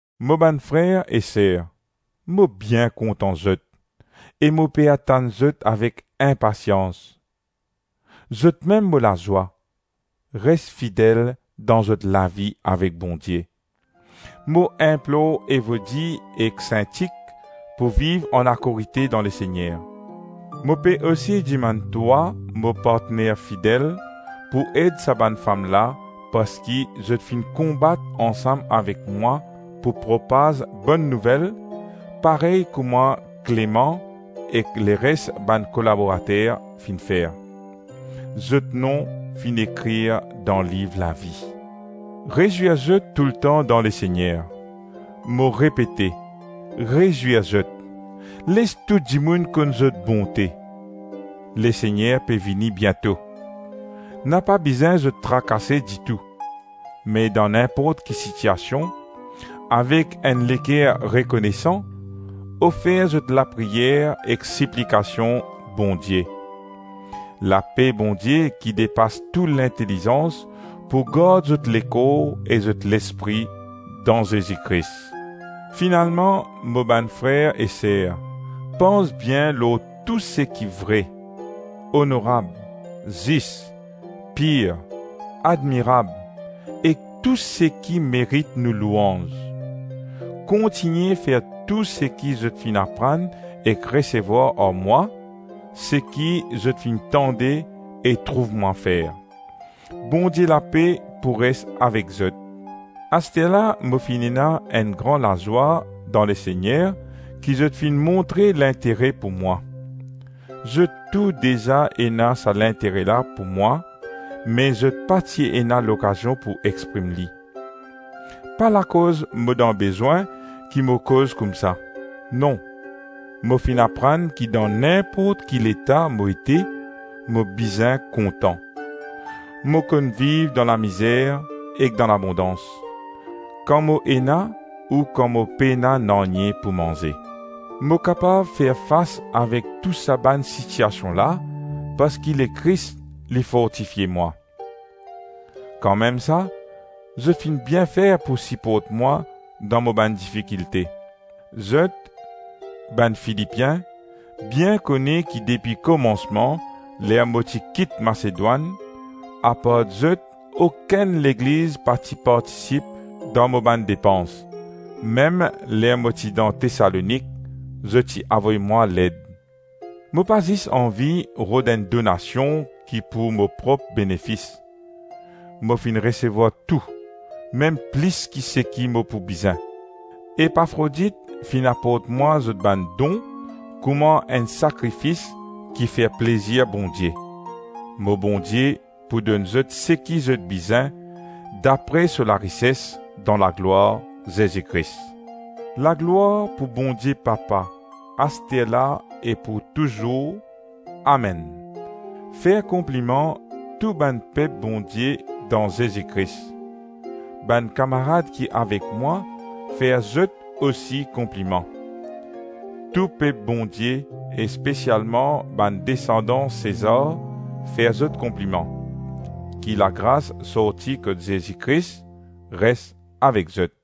Mo bann frer e ser, mo bien kontan zot, e mo pe atann zot avek inpasians. Zotmem mo lazwa; res fidel dan zot lavi avek Bondie. Mo inplor Evodi ek Sintik pou viv anakorite dan Lesegner. Mo pe osi dimann twa, mo partner, fidel pou ed sa bann fam la parski zot finn konbat ansam avek mwa pou propaz Bonn Nouvel parey kouma Kleman ek leres bann kolaborater finn fer. Zot nom finn ekrir dan liv lavi. Rezwir zot toultan dan Lesegner. Mo repete; rezwir zot. Les tou dimoun konn zot bonte. Lesegner pe vini biento. Napa bizin zot trakase ditou, me dan ninport ki sitiasion, avek enn leker rekonesan, ofer zot lapriyer ek siplikasion Bondie. Lape Bondie ki depas tou lintelizans, pou gard zot lekor ek zot lespri dan Zezi Kris. Finalman, mo bann frer e ser, pans bien lor tou seki vre, onorab, zis, pir, admirab ek tou seki merit nou louanz. Kontigne fer tou seki zot finn aprann ek resevwar ar mwa, seki zot finn tande e trouv mwa fer. Bondie lape pou res avek zot. Asterla mo ena enn gran lazwa dan Lesegner ki zot finn montre lintere pou mwa. Zot tou deza ena sa lintere la pou mwa, me zot pa ti ena lokazion pou exprim li. Pa lakoz mo dan bezwin ki mo koz koumsa, non, mo finn aprann ki dan ninport ki leta mo ete mo bizin kontan. Mo konn viv dan lamizer ek dan labondans, kan mo ena ou kan mo pena nanye pou manze. Mo kapav fer fas avek tou sa bann sitiasion la parski Lekris li fortifie mwa. Kanmemsa, zot finn bien fer pou siport mwa dan mo bann difikilte. Zot, bann Filipien bien kone ki depi komansman ler mo ti kit Masedwann, apart zot okenn legliz pa ti partisip dan mo bann depans, mem ler mo ti dan Tesalonik, zot ti avoy mwa led. Mo pa zis anvi rod enn donasion ki pou mo prop benefis. Mo finn resevwar tou, mem plis ki seki mo pou bizin. Epafrodit finn aport mwa zot bann don kouma enn sakrifis kifer plezir Bondie. Mo Bondie pou donn zot seki zot bizin dapre so larises dan laglwar Zezi Kris. Laglwar pou Bondie papa, asterla e pou touzour, amenn. Fer konpliman tou bann pep Bondie dan Zezi Kris. Bann kamarad ki avek mwa fer zot osi konpliman. Tou pep Bondie e spesialman bann desandan Sezar fer zot konpliman. Ki lagras sorti kot Zezi Kris, res avek zot.